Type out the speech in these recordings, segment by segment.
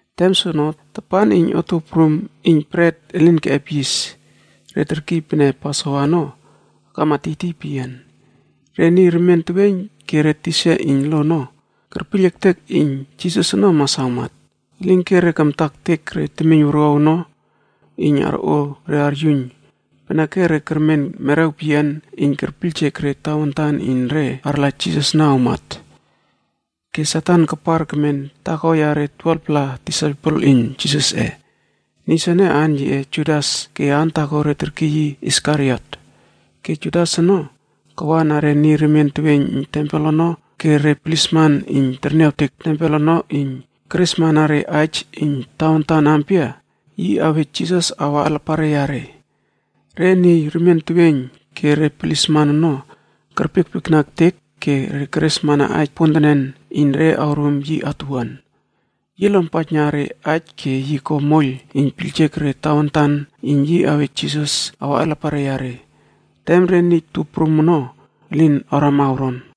Tem soono tapan iyn Otuow Prum Iyn Bret Elin Keꞌep Yis re terkiy pene Pasovaa ono akama tiytiy peyian. Re niy remien teweiyn ke re tisa iyn lo ono kerpiyl ektek iyn Jisas ono mas awmat. Elinke re kamta ektek re temiyn wuruaw ono iyn arꞌo re aryuiyn peneke re kermen merew peyian iyn kerpiyljek re tawantan iyn re arla Jisas ono awmat. Ke Satan kapar kemen taako yare 12-pla disaipel iyn Jisasꞌe. Niy soene, aan yiꞌe Judas ke aan taako re terkiy yi Iskariot. Ke Judas ono kawa na re niy remien teweiyn iyn tempel ono ke re plisman iyn terniawtek tempel ono iyn keresmana re aij iyn tawantan ampia yi awej Jisas awa alapare yare. Re niy remien teweiyn ke re plisman ono kerpiekpiekna ektek ke keresmana aij pontenen iyn re awrum yi atuwuan. Yi lonpaijna re aij ke yi ko moiyl iyn piyljek re tawantan iyn yi awej Jisas awa alapare yare, tem re niy tup prum ono elin awrama awron.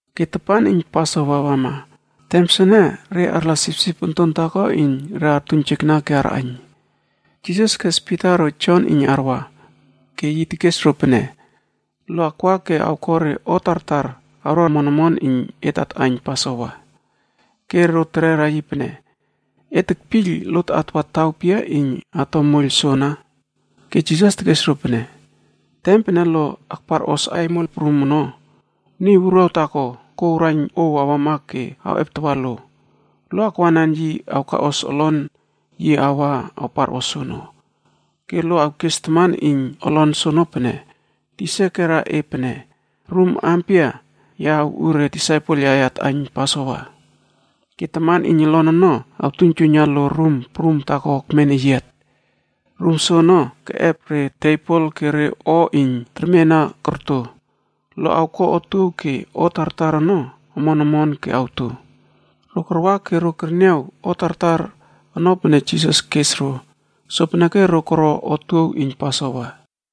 Ke tapan iyn Pasova wama. Tem soene re arla sipsip onton taako iyn re artuiynjekna ke arꞌaiyn. Jisas kes Pita ro Jon iyn arwa, ke yi tekes ro pene, “Lo akwa ke awko re o tartar awro omon omon iyn et atꞌaiyn Pasova.” Ke ro terera yi pene, “E tekpiyl lot atwa taw pia iyn ato moiyl soana?” Ke Jisas tekes ro pene, “Tem pene lo akparꞌos aimol prum ono, niy wuruaw taako kouw raiyn ouw awama ke awꞌeptawa lo. Lo akwanan yi awkaꞌos olon yi wa awparꞌos soono. “Ke lo awkes taman iyn olon soono pene, ‘Tisa kera e pene, “Rum ampia ya awꞌu re disaipel yaꞌe atꞌaiyn Pasova?” ’ Ke taman iyn olon ono awtuiynjuiyna lo rum prum taako ekmen eyiat. Rum soono keꞌep tebol ke re o iyn termena korto. Lo awko otuow ke o tartar ono omon omon ke awto.” Ro karwa ke ro kerniaw o tartar ono pene Jisas kes ro. Sopeneke ro koro otuow iyn Pasova.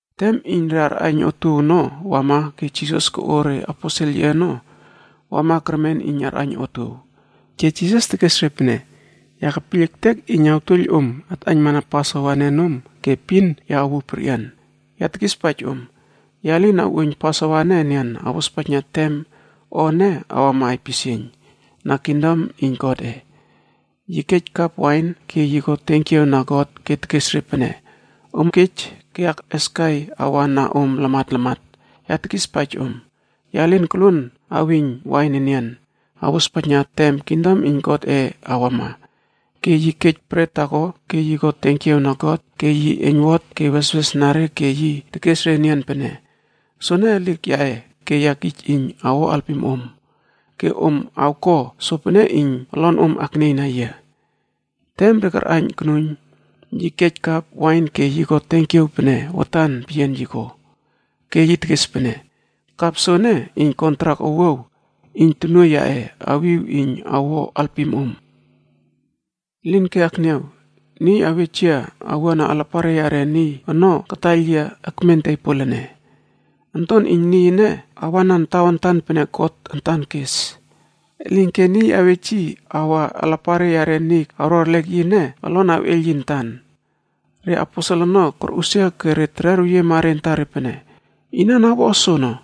Tem iyn re arꞌaiyn otuow ono wama ke Jisas koꞌo reaposel yiꞌe ono wama kermen iyn arꞌaiyn otuow. Ke Jisas tekes re pene, “Ya kepiyl ektek iyn awtuoiyl om atꞌaiynmana Pasova ene nom ke epin ya awuw perꞌian. Ya tekispaij om, ya lin awꞌuoiyn Pasova ene enian awospaijna tem o ene awama aipisieiynb na kingdom iyn Godꞌe.” Yi kej kap wain ke yi ko tenkiaw na God ke tekes re pene, “Om kej ke akꞌeskai awa na om lamat lamat. Ya tekispaij om, ya lin koluon awiyn wain enian awospaijna tem kingdom iyn Godꞌe awama.” Ke yi kej bret taako ke ko tenkiaw na God ke yi eiynwot ke weswesna re ke yi tekes re enian pene, “Soene elik yaꞌe ke ya kij iyn awo alpim om. Ke om awko sopene iyn olonom aknieyna yia.” Tem re karꞌaiyn konuiyn, yi kej kap wain ke ko tenkiaw pene watan peyian yi ko, ke tekes pene, “Kap soene iyn kontrak owuaw iyn tonuoiy yaꞌe awiw iyn awo alpim om. Elinke, akniaw! Niy awej yia awua na alapare yare niy ono kataiyl yia ekmen tebol ene. Onton iyn Niy ene awanan tawantan pene God antan kes. Elinke niy awej yi awa alapare yare niy awro erlek yi ene, olon awꞌeiyl yi antan.” Re aposel ono korꞌusia ke tererweyiema re antare pene, “Inan awo o soono?”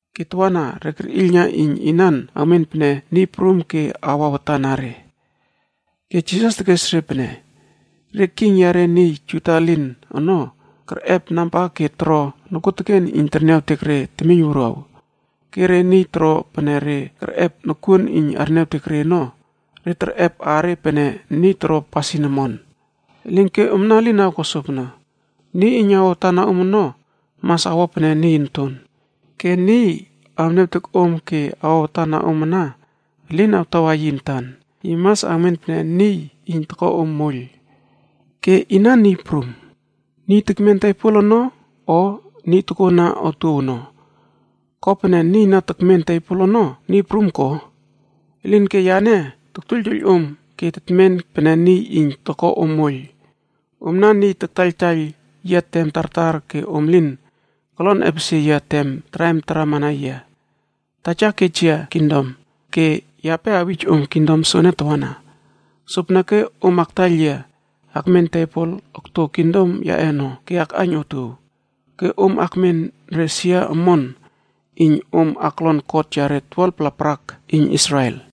Ke tawana re kerꞌiylna iyn inan awmen pene niy prum ke awa watan na re. Ke Jisas tekes re pene, “Re king yare niy Juda elin ono kerꞌep namba ke toro nokuoteken iyn terniawtek re temiyn wuruaw. Ke re niy toro pene re kerꞌep nokuon iyn terniawtek re ono, re terꞌep aare pene niy toro pasin omon. Elinke omna elin awko sopono, niy iyn awa watan na om ono, mas awo pene niy onton. Ke niy awniawtek om ke awa watan na om ana elin awtawa yi antan, yi mas awmen pene niy iyn toko om moiyl. Ke Inan niy prum? Niy tekmen tebol ono, o niy iyn tokona otuow ono?c Ko pene niy na tekmen tebol ono niy prum ko? Elinke yane toktuoiyltuoiyl om ke tekmin pene niy iyn toko om moiyl. Omna niy taktaiyltaiyl yia tem tartar ke om lin kolon epesie yia tem traim tarama na yia. Taja kej yia kingdom, ke yape awij om kingdom soene tawana. Sopeneke om aktaiyl yia akmen tebol okto kingdom yaꞌe ono, ke akꞌaiyn otuow. Ke om akmen re sia omon iyn om aklon kot yare 12-pla parak iyn Israel.”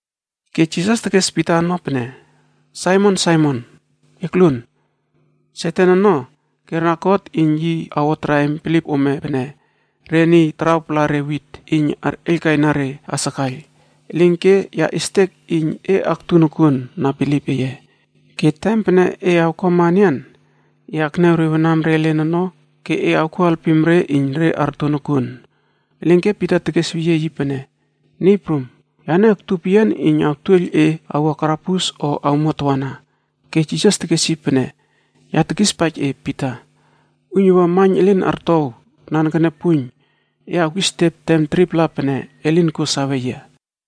Ke Jisas tekes Pita ono pene, “Saimon, Saimon, ekluon! Satan ono kera God iyn yi awo traim bilip ome pene re niy tarawpala re witd iyn arꞌeiylkaina re asakaiyl. Elinke ya estek iyn e aktu nokuon na bilip eye. Ke tem pene e awkuama enian, e akniaw re wanam re elen ono ke e awko alpim re iyn re arto nokuon.” Elinke Pita tekesweyiema yi pene, “Niy Prum, yane aktu peyian iyn awtuoiyl e awua karabus o awmuat tawana.” Ke Jisas tekes yi pene, “Ya tekispaij e Pita, uiynuwua maiyn elin artow nanekene puiyn, e awkisetiep tem 3-pla pene e lin kuo sawe yia.”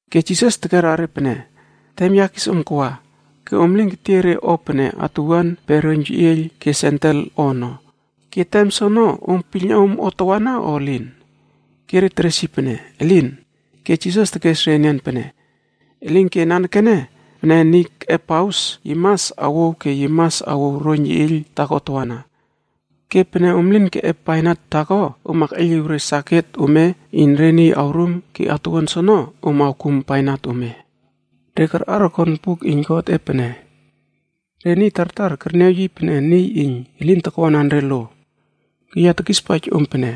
Ke Jisas tekera re pene, “Tem ya kis om kawa, ke om lin ketiey re o pene atuwuan pe roiyn yeꞌieiyl ke sendel o ono, ke tem soono om piylna om o tawana o elin?” Ke re teres yi pene, “Elin!” Ke Jisas tekes re enian pene, “Elinke, nanekene pene niy keꞌep paus, yi mas awouw ke yi mas awouw roiyn yeꞌieiyl taako tawana. Ke pene om lin keꞌep bainat taako, om akꞌeiyliw re saket ome iyn re niy awrum ke atuwuan soono om awkum bainat ome. Re karꞌar okon buk iyn Godꞌe pene, ‘Re niy tartar kerniaw yi pene niy iyn elin takwanan re lo.’e Ke ya tekispaij om pene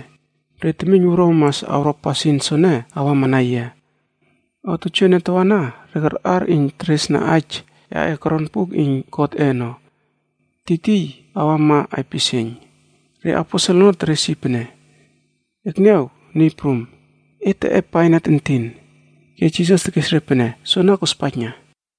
re temiyn wuruaw mas awro pasin soene awamana yia. O tojoene tawana re karꞌar iyn teresna aij yaꞌe koron buk iyn Godꞌe ono, tiytiy awama aipisieiyn.” Re aposel ono teres yi pene, “Ekniaw, Niy Prum, et teꞌep bainat entin.” Ke Jisas tekes re pene, “Soana korospaijna.”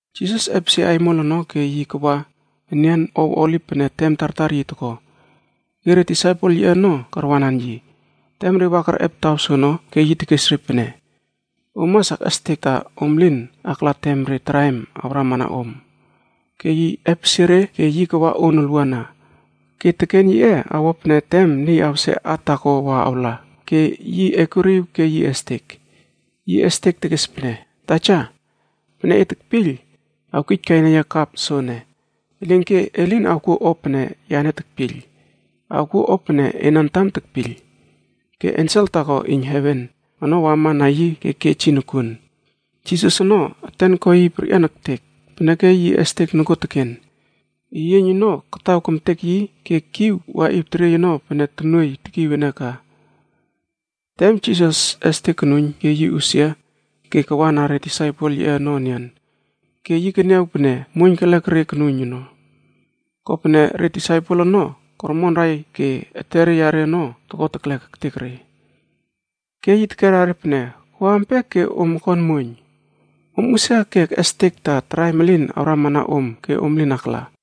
Jisas epesie aimol ono ke yi kawa enian ow Oliv pene tem tartar yi toko. Ke re disaipel yiꞌe ono karwanan yi. Tem re wa kerꞌep taw soono ke yi tekes re pene, “Om mas akꞌestek ta om lin akla tem re o kokelek awramana om.” Ke yi epesie re ke yi kawa on olwuana, ke teken yiꞌe awo pene tem niy awse at taako wa awla. Ke yi ekuriw ke yi estek. Yi estek tekes pene, “Taja, pene e tekpiyl, awkijkaina yia kapf soene. Elinke e lin awkuo o pene yane tekpiyl, awkuo o pene ena antam tekpiyl.” Ke ensel taako iyn heven ono wama na yi ke kej yi nokuon. Jisas ono eten ko yi perꞌian ektek, peneke yi estek nokuoteken. Eyieiyn ono kataw kemtek yi ke kiw waꞌiw teriey ono pene tonuoiy tekiw ene ka. Tem yi estek konuiyn ke yi usia ke kawana re disaipel yiꞌe ono enian, ke yi keniaw pene muoiyn kelek re konuiyn ono. Kopene re disaipel ono kormonrai ke etere yare ono, toko teklek ektek re. Ke yi tekera re pene, “Ko ampia ke om okon muoiyn? Om usia ke ekꞌestek ta re o kokelek ono elin awramana om ke om lin akla.”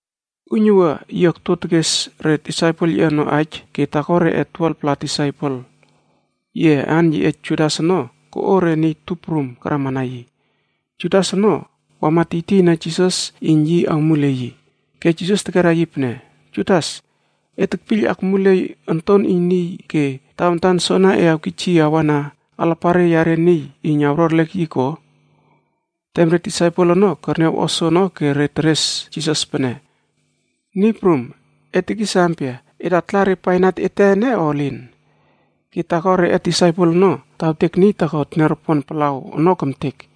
Uiynuwua yi okto tekes re disaipel yiꞌe ono aij ke taako reꞌe 12-pla disaipel yiꞌe aan yiꞌe Judas ono koꞌo re niy tup prum karamana yi. Judas ono wama tiytiyna Jisas iyn yi awmulieiy yi. Ke Jisas tekera yi pene, “Judas, e tekpiyl akmuliey Onton iyn Niy ke tawantan soana e awkij yi awa alapare yare niy iyn awro erlek yi ko?” Tem re disaipel ono kerniaw o soono ke re teres Jisas pene, “Niy Prum, e tekis ampia, et atla re bainat ete ene o elin?” Ke taako reꞌe disaipel ono tawtek niy taako teniaropon palaw ono kemtek.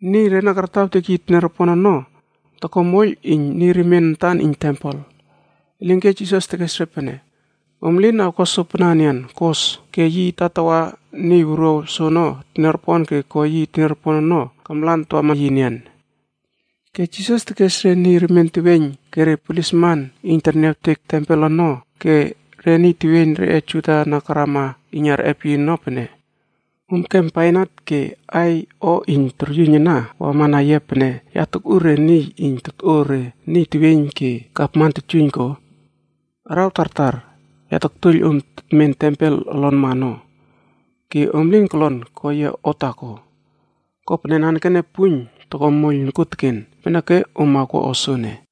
Niy re na kartawtek yi teniaropon ono, toko moiyl iyn niy remien antan iyn tempel. Elinke Jisas tekes re pene, “Om elin awko sopana enian. Kos!” Ke yi tatawa niy wuruaw soono teniaropon ke ko yi teniaropon ono kamlan tawama yi enian. Ke Jisas tekes re niy remien teweiyn ke re plisman iyn terniawtek tempel ono ke re niy teweiyn reꞌe Juda na karama iyn arꞌep yi ono pene, “Om kem bainat ke aiy o iyn toryuiyn ana wama na yia pene ya takꞌu re niy iyn totꞌo re niy teweiyn ke gavman totyuiyn ko? Araw tartar ya taktuoiyl om tetmen tempel olonma ono ke om lin kolon ko yia o taako. Kopene nanekene ene, lijek toko moiyl yiꞌe nokuon peneke om awko o soene.”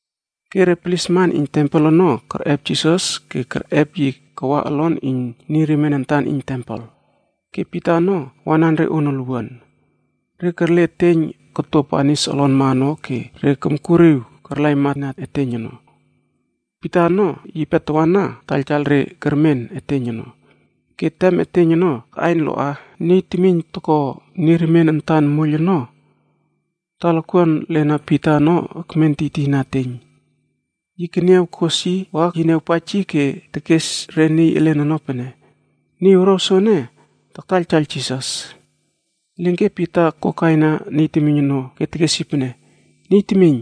Ke re plisman iyn tempel ono kerꞌep Jisas ke kerꞌep yi kawa olon iyn niy remien antan iyn tempel. Ke Pita ono wanan re on olwuana. Re kerle eteiyn koto banis olonma ono ke re komkuriw karlaimana eteiyn ono. Pita ono yipe tawana taiyltaiyl re kermen eteiyn ono. Ke tem eteiyn ono kaꞌaiyn loꞌa, niy temiyn toko niy remien antan moiyl ono talakuan lena Pita ono ekmen tiytiy na eteiyn. Yi keniaw kos yi wa yi niawpaij yi ke tekes re niy elen ono pene, “Niy wuruaw soene taktaiyltaiyl Jisas.” Elinke Pita kokaina niy temiyn ono ke tekes pene, “Niy temiyn,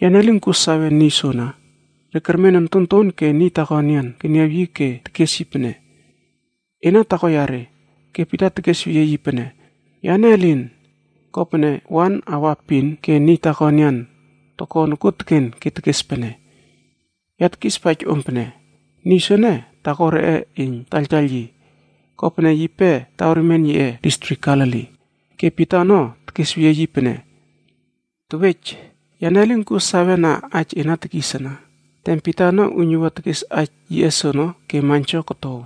ya lin kuo sawe niy soana.” Re kermen ontonton ke niy taako enian keniaw yi ke tekes yi pene, “Ena taako yare.” Ke Pita tekesweyie yi pene, “Yane elin.” Kopene wan aua epin ke niy taako enian toko nokuoteken ke tekes pene, “Ya tekispaij om pene, niy soene taako reꞌe iyn taktaiyl yi. Kopene yipe taw remien yiꞌe distrik Galili.” Ke Pita ono tekesweyie yi pene, “Tewej, yane lin kuo sawe na aij e na tekis ana.” Tem Pita ono uiynuwua tekes aij yiꞌe soono ke maiynjo kotow.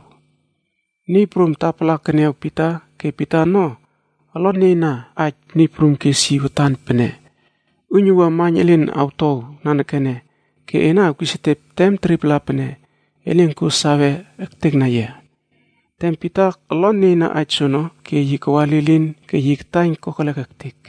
Niy Prum tapala keniaw Pita ke Pita ono olon nieyna aij Niy Prum kes yi watan pene, “Uiynuwua maiyn elin awtow nanekene, ke ena awkisetiep tem 3-pla pene e lin kuo sawe ektekna yia.” Tem Pita olon nieyna aij soono, ke yi kawa lilin ke yi kataiyn kokelek ektek.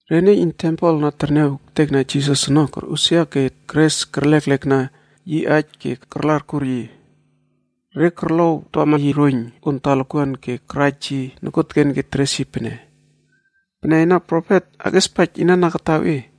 Re niy iyn tempel na terniaw ektekna Jisas ono korꞌusia ke keres kerleklekna yi aij ke karla arkur yi. Re korlowtawama yi roiyn on talakuan ke karaj yi nokuoteken ke teres yi pene, “Pene ena profet, akꞌiespaij niy kataw e ene?”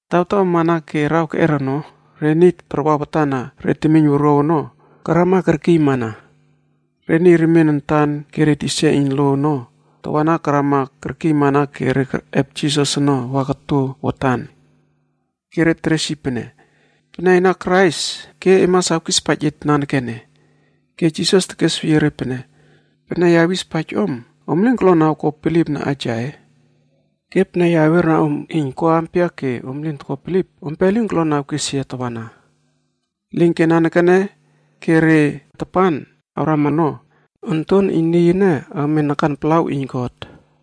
Tawtaw amana ke araw keꞌer ono, re niy tarwa watan na re temiyn wuruaw ono karama kerkiymana. Re niy remien antan ke re tisa iyn lo ono tawana karama kerkiymana ke re kerꞌep Jisas ono wama koto watan. Ke re teres yi pene, “Pene ena Krais ke e mas awkispaij et nanekene.” Ke Jisas tekesweyie re pene, “Pene ya awispaij om, om lin kolon awko bilipna aij yaꞌe. Ke pene ya awiera om iyn ko ampia ke om lin toko bilip, ompe lin kolon awkes yia tawana. Elinke nanekene ke re tapan awrama ono, Onton iyn Niy ene awmen nakan palaw iyn God,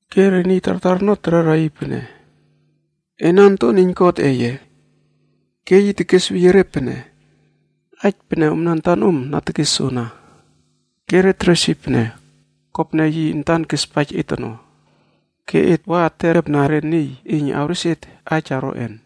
Ke re niy tartar ono terera yi pene, “Ena Onton Wuruaw iyn Godꞌe ye?” Ke yi tekesweyie re pene, “Aij pene omna antanom na tekes soana.” Ke re teres pene, “Kopene yi antan kespaij et ono ke et wa tetꞌepna re niy iyn awrespaij et aij oroꞌen?”